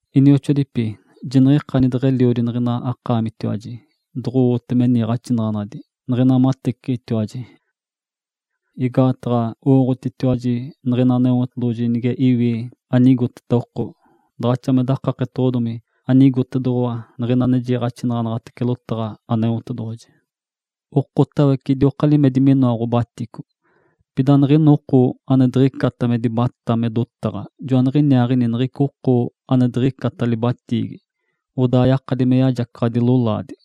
Inioxoadipi, jiniɡ̶ikani deɡ̶eliodi niɡ̶ina akaamitiwaji doɡ̶owote me niiɡ̶axinaɡ̶anadi niɡ̶ina mateciɡ̶itiwaji. Igaataɡ̶a owooɡ̶otitiwaji niɡ̶ina Aneotedoɡ̶oji nige iwi anigoteta oko, daɡ̶axa me dakaketoɡ̶odomi anigotedoɡ̶owa niɡ̶ina ane jiiɡ̶axinaɡ̶anaɡ̶atece lotaɡ̶a Aneotedoɡ̶oji. Okotawece idioka limedi minoa ɡ̶obatico. Pida niɡ̶ina oko ane diɡ̶icata me dibatá me dotaɡ̶a, joaniɡ̶iniaaɡ̶ini niɡ̶ica oko ane diɡ̶icata libatiigi, odaa yakadi me yajacaɡ̶adi lolaadi.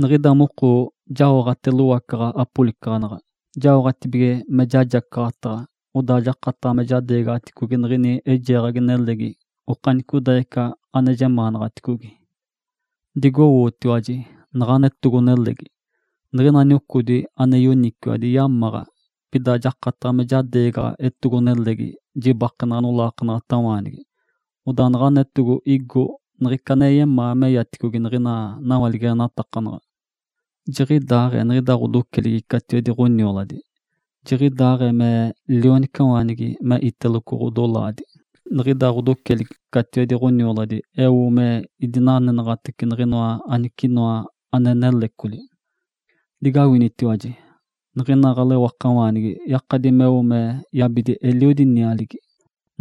Niɡ̶ida moko jaoɡ̶ate lowacaɡ̶a apolicaɡ̶anaɡ̶a jaoɡ̶atibige me jajacaɡ̶ataɡ̶a, odaa jakataɡ̶a me jadeegaɡ̶aticogi niɡ̶ini eijeeɡ̶agi nelegi okanicodaaɡ̶ica ane jemaanaɡ̶aticogi. Digowootiwaji naɡ̶ana etogo-nelegi. Niɡ̶ina niocodi ane yoniciwadi yamaɡ̶a, pida jakataɡ̶a me jadeegaɡ̶a etogo-nelegi jibakenaɡ̶a nolaakanaɡ̶atawaanigi. Odaa naɡ̶ana etogo igo niɡ̶ica ane yemaa meyaticogi niɡ̶ina nawaligenatakanaɡ̶a. Jiɡ̶idaaɡ̶ee niɡ̶ida ɡ̶odoceligi catiwedi ɡ̶onioladi. Jiɡ̶idaaɡ̶ee me lionicawaanigi me iteloco ɡ̶odolaadi, niɡ̶ida ɡ̶odoceligi catiwedi ɡ̶onioladi eote me idinanenaɡ̶atece niɡ̶inoa anicinoa ane nelecoli. Digawinitiwaji! Niɡ̶ina ɡ̶alewakawaanigi yakadi meo me yabidi eliodi nialigi.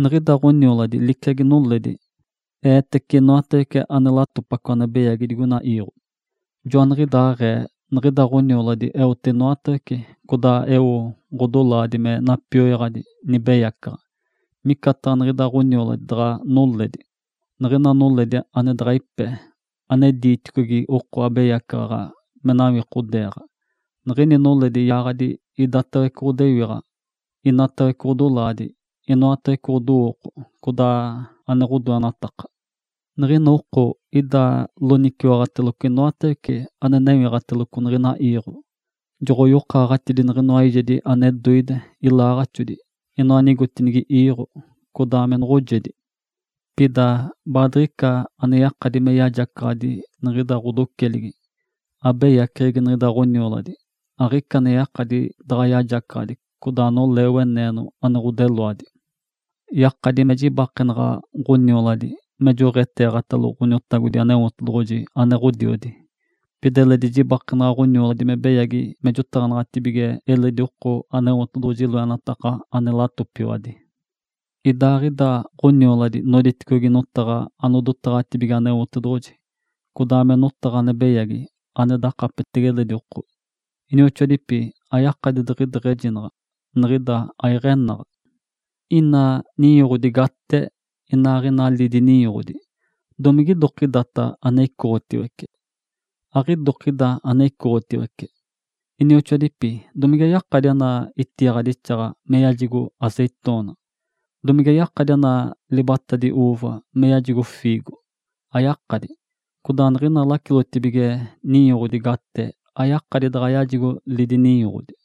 Niɡ̶ida ɡ̶onioladi liciagi noledi. Eetece inoatawece ane latopaco ane beyagi digoina iiɡ̶o. Joaniɡ̶idaaɡ̶ee niɡ̶ida ɡ̶onioladi eote inoatawece codaa eo ɡ̶odolaadi me napioyaɡ̶adi nibeyacaɡ̶a. Micataɡ̶a niɡ̶ida ɡ̶onioladi daɡ̶a noledi, niɡ̶ina noledi ane daɡ̶a ipe, ane diiticogi oko abeyacaɡ̶aɡ̶a me nawikodeeɡ̶a. Niɡ̶ini noledi yaaɡ̶adi idatawece ɡ̶odewiɡ̶a, inatawece ɡ̶odolaadi, inoatawece ɡ̶odowooko, codaa ane ɡ̶odoenataka. Niɡ̶ina oko ida loniciwaɡ̶ateloco inoatawece ane newiɡ̶ateloco niɡ̶ina iiɡ̶o. Joɡ̶oyokaaɡ̶atidi niɡ̶inoa eijedi ane doide, ilaaɡ̶axodi, inoa anigotinigi iiɡ̶o, codaa me noɡ̶ojedi. Pida baadiɡ̶ica ane yakadi me yajacaɡ̶adi niɡ̶ida ɡ̶odoceligi. Abeyaceɡ̶egi niɡ̶ida ɡ̶onioladi, aɡ̶ica ane yakadi daɡ̶a yajacaɡ̶adi, codaa nolee weneeno ane ɡ̶odeloadi. Yakadi me jibakenaɡ̶a ɡ̶onioladi me joɡ̶eeɡ̶atalo Ǥoniotagodi Aneotedoɡ̶oji ane Ǥodiodi. Pida eledi jibakenaɡ̶a ɡ̶onioladi me beyagi me jotaɡ̶anaɡ̶atibige eledi oko Aneotedoɡ̶oji loenataka ane latopiwadi. Idaaɡ̶ida ɡ̶onioladi noditicogi notaɡ̶a anodoɡ̶etetibigimece Aneotedoɡ̶oji, codaa me notaɡ̶a ane beyagi ane dakapetege eledi oko. Inioxoadipi, ayakadi diɡ̶ideɡ̶ejinaɡ̶a, niɡ̶ida aiɡ̶enaɡ̶a. Ina ninyoɡ̶odi gate, inaaɡ̶ina lidi ninyoɡ̶odi, domigidokidata ane icoɡ̶otiwece? Aɡ̶idokida ane noditicogi! Inioxoadipi, domige yakadi ana itiiɡ̶adixaɡ̶a me yajigo azeitona? Domige yakadi ana libatadi uuva me yajigo fiigo? Ayakadi! Codaa niɡ̶ina lacilotibige ninyoɡ̶odi gate ayakadi daɡ̶a yajigo lidi ninyoɡ̶odi.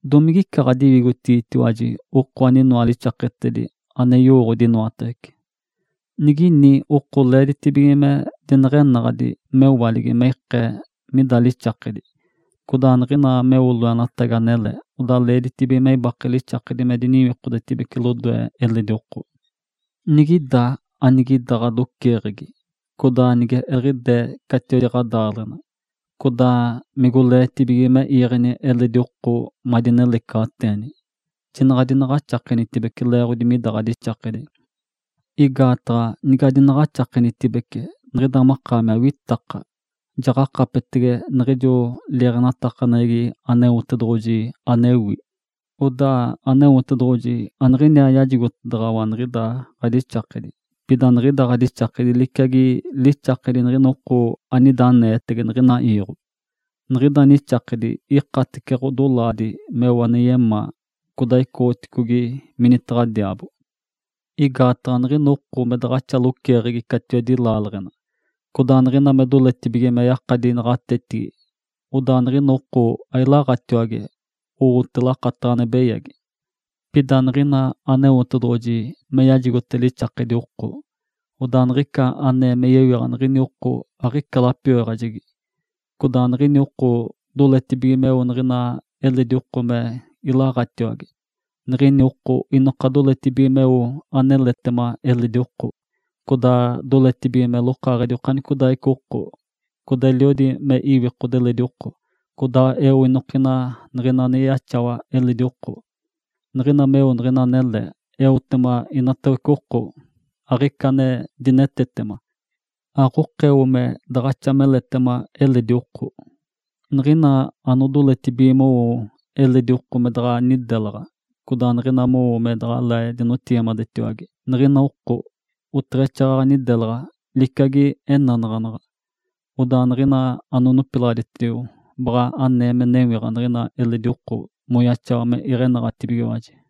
Domigica ɡ̶adiwigotigitiwaji oko aninoa lixaketedi, ane yowooɡ̶odi inoatawece? Niɡ̶ini oko leeditibige me dineɡ̶enaɡ̶adi mewaligi me ikee mida lixakedi. Codaa niɡ̶ina meo loenatagi anele, odaa leeditibige me ibake lixakedi me diniwikodetibece lodoe eledi oko. Nigida anigida ɡ̶adoceeɡ̶egi, codaa nige eliɡ̶idee catiwedi ɡ̶adaaleɡ̶ena, codaa migoleetibige me iiɡ̶eni eledi oko madinelecaɡ̶ateeni, jinaɡ̶a adinaɡ̶axakenitibece leeɡ̶odi mida ɡ̶adixakedi. Igaataɡ̶a nigadinaɡ̶axakenitibece, niɡ̶ida makaami awitaka, jaɡ̶akapetege niɡ̶ijo liiɡ̶axinaɡ̶aneɡ̶egi Aneotedoɡ̶oji anewi. Odaa Aneotedoɡ̶oji aniɡ̶iniaa yajigotedaɡ̶awa niɡ̶ida ɡ̶adixakedi, pida niɡ̶ida ɡ̶adixakedi liciagi lixakedi niɡ̶ina oko anida aneetege niɡ̶ina iiɡ̶o. Niɡ̶ida nixakedi ikatece ɡ̶odolaadi meo ane yemaa, codaa icoɡ̶oticogi minitaɡ̶a diaabo. Igaataɡ̶a niɡ̶ina oko me daɡ̶axa loceeɡ̶egi catiwedi laaleɡ̶ena, codaa niɡ̶ina me doletibige me yakadi naɡ̶atetigi, odaa niɡ̶ina oko ailaɡ̶atiwage, owote lakataɡ̶a ane beyagi. Pida niɡ̶ina Aneotedoɡ̶oji me yajigote lixakedi oko, odaa niɡ̶ica anee me yewiɡ̶a niɡ̶ini oko aɡ̶ica lapioyaɡ̶ajegi. Codaa niɡ̶ini oko doletibige meo niɡ̶ina eledi oko me ilaɡ̶atiwage. Niɡ̶ini oko inoka doletibige meo aneletema eledi oko, codaa doletibige me lokaaɡ̶edi okanicodaaɡ̶ica oko. Codaa eliodi me iwikode eledi oko, codaa eo inokina niɡ̶ina ane yaxawa eledi oko. Niɡ̶ina meo niɡ̶ina anele, eotema inatawece oko, aɡ̶ica ane dinetetema. Aɡ̶okeo me daɡ̶axa meletema eledi oko. Niɡ̶ina anodoletibige mowo eledi oko me daɡ̶a nidelaɡ̶a, codaa niɡ̶ina mowo me daɡ̶alee dinotigimadetiwage niɡ̶ina oko, oteɡ̶exaaɡ̶aɡ̶a nidelaɡ̶a, liciagi enanaɡ̶anaɡ̶a. Odaa niɡ̶ina anonopilaɡ̶aditio baɡ̶a anee me newiɡ̶a niɡ̶ina eledi oko moyaxawa me iɡ̶enaɡ̶atibigiwaji.